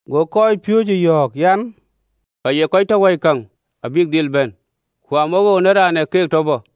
Go kɔcpiööcë yɔ̈ɔ̈k an, “Ka ye kɔc tɔ loi kërac abïk dhil bɛ̈n: ku amawoou në raan ë keek tɔ bɔ̈!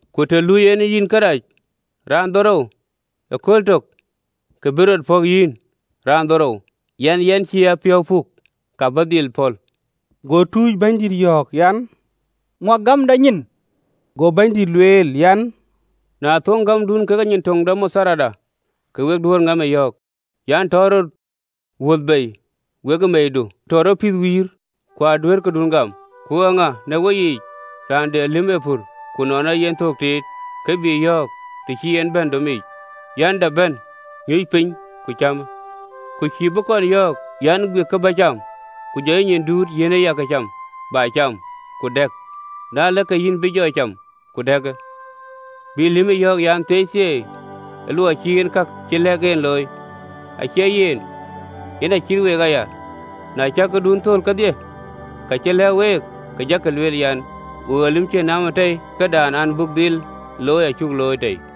Ku të lui yen yïn kërac raandhorou ëkööl tök, ku be rɔt pɔ̈k yïn raandhorou an, ‘Yɛn cï a piɔ̈u puk,’ ka bä dhil pɔ̈l. Go tuuc Bɛ̈nydït yɔ̈ɔ̈k an, “Ŋuak gämda nyin.” Go Bɛ̈nydït lueel an, “Na thöŋ gämdun kekë nyin töŋ de matharda, ke we duëër ŋaapë yɔ̈ɔ̈k an, ‘Tɔ rɔt wuthë bei wekë meeidu, ku tɔ rɔt pith wïïr!’ Ku aduëër këdun gam. “Ku eeŋa në weyiic, raan de lïm ee pur, ku nɔn ee yen thök tiit, ke bï yɔ̈ɔ̈k, të cï en bɛ̈n domic, an, dap bɛ̈n nyuc piny ku cämë? Ku cïï bï kɔn yɔ̈ɔ̈k an, ‘Guik kë bä cam, ku jɔ yïyic duut, yiɛ̈në ya këcam, bä cam ku dɛ̈k: na ëlë, ke yïn bï jɔ cam ku dɛ̈kë.’ Bï lïmë yɔ̈ɔ̈k an, thieithieei, luɔi cï en ka cï lɛ̈k en looi? Acie yen. Yen acït week aya, na cäk kakun thöl kedhie, ka cï lɛ̈k week, ke jakï lueel an, ‘Wok ee lïïm cïn naamda tei: këdan an, buk dhil looi acuk looi tei.”’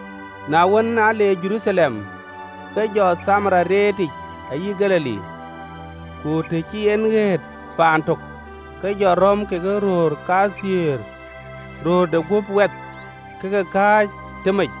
Na wën, aa le Jeruthalem, ke jɔ Thamaria reetic ayï Galili. Ku të cï en ɣet paan tök, ke jɔ rɔ̈m ke röör kathiëër, röör de gup wɛth, ke ke kääc tëmec: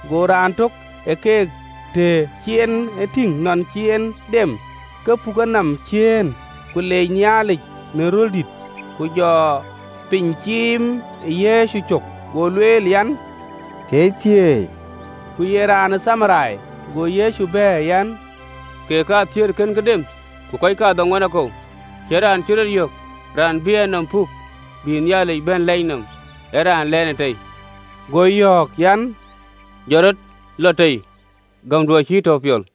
Go raan tök ë keek, të cï en e tïŋ nɔn cï en dem, ke puk enɔm ciëën, ke lec Nhialic në röl dït, Ku jɔ piny ciim ë Yecu cök, lueel an, thieithieei: Ku ye raan ë Thamaria. Go Yecu bɛ̈ɛ̈r an, “Kek kathiëër kënkï dem? Ku kɔc kadhoŋuan akou? Cïn raan cï röt yök, raan bï enɔm puk bï Nhialic bɛ̈n lɛc nɔm, ee raan lɛɛnë tei?” Go yɔ̈ɔ̈k an, “Jɔt rɔt, lɔ tei: gämdu acï yï tɔ piɔl.”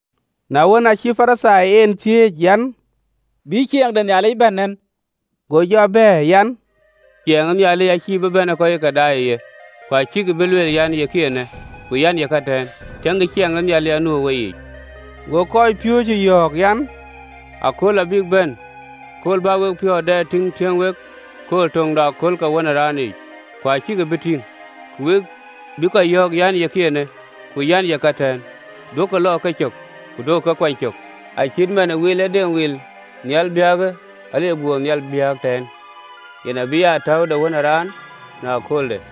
Na wën, acï Parithai en thiëëc an, “Bï ciɛɛŋ de Nhialic bɛ̈n nɛn? Ke jɔ bɛ̈ɛ̈r an, “Ciɛɛŋ de Nhialic acïï bï bɛ̈n ke kɔc ë ke daai ë ye. Ku acïkï bï lueel an, ‘Yekï eenë!’ Ku an, ‘Yeka ëtɛ̈ɛ̈n!’ Tiëŋkï, Ciɛɛŋ de Nhialic atɔ̈u ë weyiic.” Go kɔcpiööcë yɔ̈ɔ̈k an, “Akööl abïk bɛ̈n, akööl bä wek piɔ̈ɔ̈th dɛ tïŋ tiëŋ wek kööl töŋ de akööl ke Wën ë Raan yiic, ku acäkï bï tïŋ. Ku we bïï kɔc yɔ̈ɔ̈k an, ‘Yekï eenë!’ Ku, an, ‘Yeka ëtɛ̈ɛ̈n!’ Duökï lɔ ë kecök, ku duökï ke kuany cök. Acït man ë wilëdeŋ ee wil tënhial biäk a le gut nhial biäk tɛ̈ɛ̈n, yen abï aa täu de Wën ë Raan në köölde.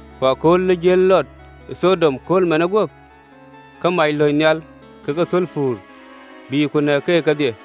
Ku kööl ë jiël Lɔt ë Thɔdom, kööl manë guöp, ke mac löny nhial kekë thulpur, bï ku nɛ̈k keek kedhie.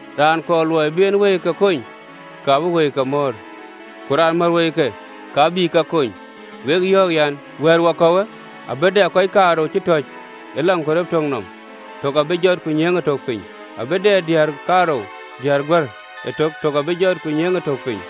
Raan kɔɔr luɔi bï en wëike kony, ka bï ke mɔ̈ɔ̈r, ku raan mär wëike, ka bï ke kony. Wek yɔ̈ɔ̈k an, wɛ̈ɛ̈rwäkɔ̈uwë, abï dɛ kɔc kaarou cï tɔ̈c ë agen nɔm, tök abï jɔt, ku nyiëëŋë tök piny. Abï dɛ diäär kaarou diëër guär ëtök, tök abï jɔt, ku nyiëëŋë tök piny.